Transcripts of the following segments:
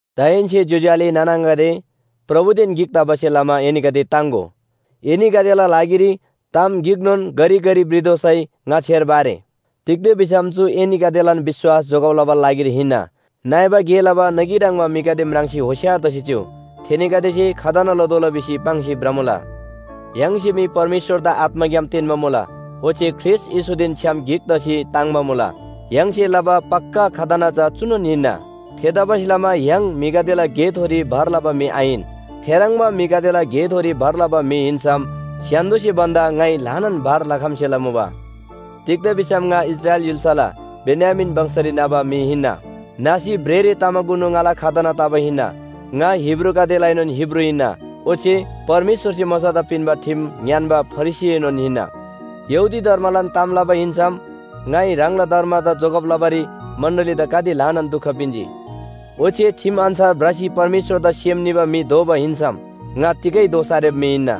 दाहेन्‍से ज्‍योज्‍यो आले नाना आङागदे, प्रभुदेन गिक तबासे लमा एनीगदे ताङ्‍गो। एनीगदेला लागिरी ताम गिकनोन घरिघरि भ्रितोःसै ङा छेर्बा आरे। तिग्‍दा भिसम चु एनीगदेलान विश्‍वास जोगब लबाला लागिरी हिन्‍ना। नइबा गे लबा नगी ह्रङ्‌बा म्‍हिगदे म्राङ्सी होशियार तसी चिउ। थेनीगदेसे खतना लतोःला भिसी पाङ्सी भ्रमुला। य्‍हाङसे मी परमेश्‍वरदा आत्‍माग्‍याम तेन्‍बा मुला। ओच्‍छे ख्रीष्‍ट येशूदेन छ्‌याम गिक तसी ताङ्‍बा मुला। य्‍हाङसे लबा पक्‍का खतना चा चुनोन हिन्‍ना। थेतबासेलमा य्‍हाङ म्‍हिगदेला गेथोरी भर लबा म्‍हि आहिन। थेह्रङ्बा म्‍हिगदेला गेथोरी भर लबा म्‍हि हिन्‍सम स्‍य्‍हान्‍दोसे भन्‍दा ङाइ ल्‍हानान भर लखम्‍सेला मुबा। तिग्‍दा भिसम ङा इस्राएल य्‍हुलला बेन्‍यामीन वंशरी न्‍हबा म्‍हि हिन्‍ना। न्‍हसी भ्रेःरे तमाकुनु ङाला खतना तबा हिन्‍ना। ङा हिब्रूगदेलाएनोन हिब्रू हिन्‍ना, ओच्‍छे परमेश्‍वरसे मोशादा पिन्‍बा ठिम ङ्‌यान्‍बा फरिसीएनोन हिन्‍ना। यहूदी धर्मलान ताम लबा हिन्‍सम ङाइ ह्राङला धर्मदा जोगब लबारी मण्‍डलीदा गाते ल्‍हानान दुख पिन्‍जी। ओच्‍छे ठिम अन्‍छार भ्रसी परमेश्‍वरदा सेम निबा म्‍हि दोबा हिन्‍सम ङा तिगै दोष आरेबा म्‍हि हिन्‍ना।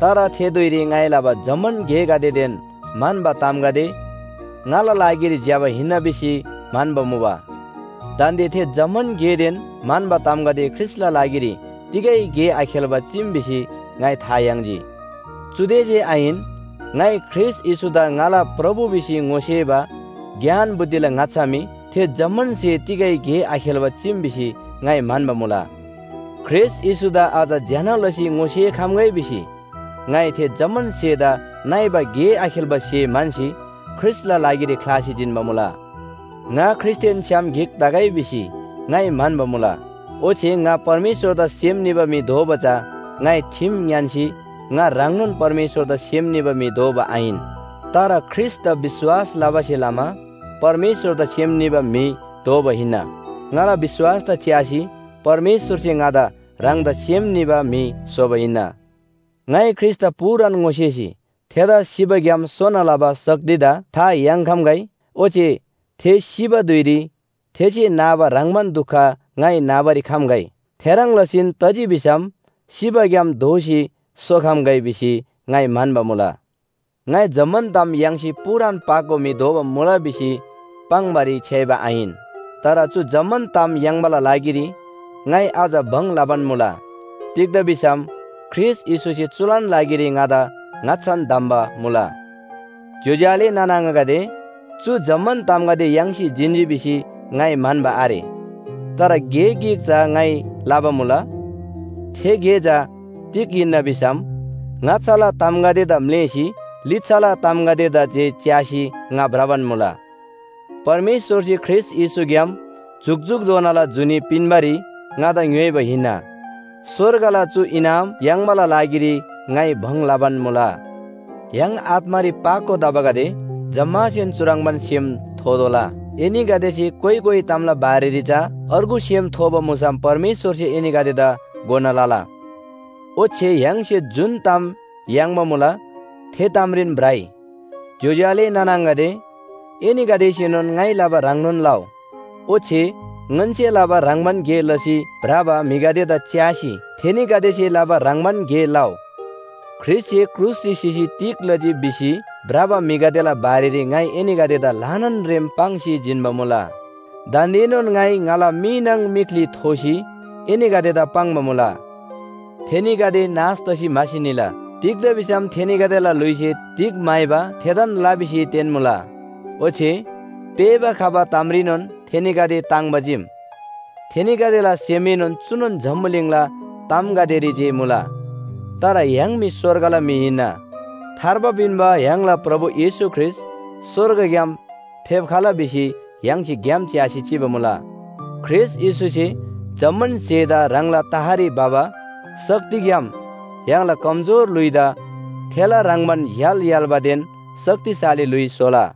तर थे धुइरी ङाइ लबा जम्‍मान गेगदेदेन म्‍हन्‍बा तामगदे ङाला लागिरी ज्‍यबान हिन्‍ना भिसी म्‍हन्‍बा मुबा। दान्‍दे थे जम्‍मान गेदेन म्‍हन्‍बा तामगदे ख्रीष्‍टला लागिरी तिगै गे आखेल्‍बा चीम भिसी ङाइ था याङ्जी। चुदे जे आहिन, ङाइ ख्रीष्‍ट येशूदा ङाला प्रभु भिसी ङोसेबा ज्ञान बुद्धिला ङाच्‍छा मी थे जम्‍मान स्‍हे तिगै गे आखेल्‍बा चीम भिसी ङाइ म्‍हन्‍बा मुला। ख्रीष्‍ट येशूदा अझ ज्‍यना लसी ङोसेखम्‍गै भिसी ङाइ थे जम्‍मान स्‍हेदा नइबा गे आखेल्‍बा स्‍हे म्‍हन्‍सी ख्रीष्‍टला लागिरी ख्‍लासी जिन्‍बा मुला। ङा ख्रीष्‍टदेन छ्‌याम गिक तगै भिसी ङाइ म्‍हन्‍बा मुला। ओच्‍छे ङा परमेश्‍वरदा सेम निबा म्‍हि दोबा चा ङाइ ठिम ङ्‌यान्‍सी ङा ह्राङनोन परमेश्‍वरदा सेम निबा म्‍हि दोबा आहिन। तर ख्रीष्‍टदा विश्‍वास लबासे लमा परमेश्‍वरदा सेम निबा म्‍हि दोबा हिन्‍ना। ङाला विश्‍वासदा च्‍यासी परमेश्‍वरसे ङादा ह्राङदा सेम निबा म्‍हि स्‍होबा हिन्‍ना। ङाइ ख्रीष्‍टदा पूरान ङोसेसी थेदा सिबाग्‍याम सोना लबा शक्तिदा था याङ्‌खम्‍गै, ओच्‍छे थे सिबा धुइरी थेसे नाबा ह्रङ्‌बान दुख ङाइ नाबारी खम्‍गै। थेह्रङ् लसीन तजी भिसम सिबाग्‍याम दोःसी सोखम्‍गै भिसी ङाइ म्‍हन्‍बा मुला। ङाइ जम्‍मान ताम याङ्सी पूरान पाको म्‍हि दोबा मुला भिसी पाङ्‌बारी छ्‌याइबा आहिन। तर चु जम्‍मान ताम याङ्बाला लागिरी ङाइ अझ भङ लबान मुला। तिग्‍दा भिसम ख्रीष्‍ट येशूसे चुलान लागिरी ङादा ङाच्‍छान धम्‍बा मुला। ज्‍योज्‍यो आले नाना आङागदे, चु जम्‍मान तामगदे याङ्सी जिन्‍जी भिसी ङाइ म्‍हन्‍बा आरे। तर गे गिक चा ङाइ लबा मुला। थे गे चा तिग हिन्‍ना भिसम ङाच्‍छाला तामगदेदा म्‍लेःसी लिच्‍छाला तामगदेदा जे च्‍यासी ङा भ्रबान मुला। परमेश्‍वरसे ख्रीष्‍ट येशूग्‍याम जुकजुकधोनाला जुनी पिन्‍बारी ङादा ङ्‌योइबा हिन्‍ना। स्‍वर्गला चु इनाम याङ्बाला लागिरी ङाइ भङ लबान मुला। य्‍हाङ आत्‍मारी पाको तबागदे जम्‍मासेन चुह्रङ्बान सेम थोतोःला। एनीगदेसे कोइ कोइ तामला बारेरी चा अर्गु सेम थोबा मुसम परमेश्‍वरसे एनीगदेदा घोना लला। ओच्‍छे य्‍हाङसे जुन ताम याङ्बा मुला, थे तामरीन भ्रइ। ज्‍योज्‍यो आले नाना आङागदे, एनीगदेसेनोन ङाइ लबा ह्रङ्नोन लउ। ओच्‍छे ङन्‍से लबा ह्रङ्‌बान गे लसी भ्रबा म्‍हिगदेदा च्‍यासी थेनीगदेसे लबा ह्रङ्‌बान गे लउ। ख्रीष्‍टसे क्रुसरी सिसी तिग लजी भिसी भ्रबा म्‍हिगदेला बारेरी ङाइ एनीगदेदा ल्‍हानान रेम पाङ्सी जिन्‍बा मुला। दान्‍देनोन ङाइ ङाला मी नाङ मीख्‍ली थोसी एनीगदेदा पाङ्बा मुला। थेनीगदे नाश तसी म्‍हासी निला। तिग्‍दा भिसम थेनीगदेला ल्‍हुइसे तिग म्‍हाइबा थेदान ल भिसी तेन्‍मुला। ओच्‍छे पेःबा खबा तामरीनोन थेनीगदे ताङ्‍बा चीम। थेनीगदेला सेमएनोन चुनोन जम्‍बुलिङला तामगदेरी जे मुला। तर य्‍हाङ मी स्‍वर्गला म्‍हि हिन्‍ना। थार्बा पिन्‍बा य्‍हाङला प्रभु येशू ख्रीष्‍ट स्‍वर्गग्‍याम फेप्‍खला भिसी य्‍हाङसे ग्‍याम च्‍यासी चिबा मुला। ख्रीष्‍ट येशूसे जम्‍मान स्‍हेदा ह्राङला तहरी भबा शक्तिग्‍याम य्‍हाङला कमजोर ल्‍हुइदा थेला ह्रङ्‌बान य्‍हाल य्‍हाल्‍बादेन शक्तिशाली ल्‍हुइ स्‍होला।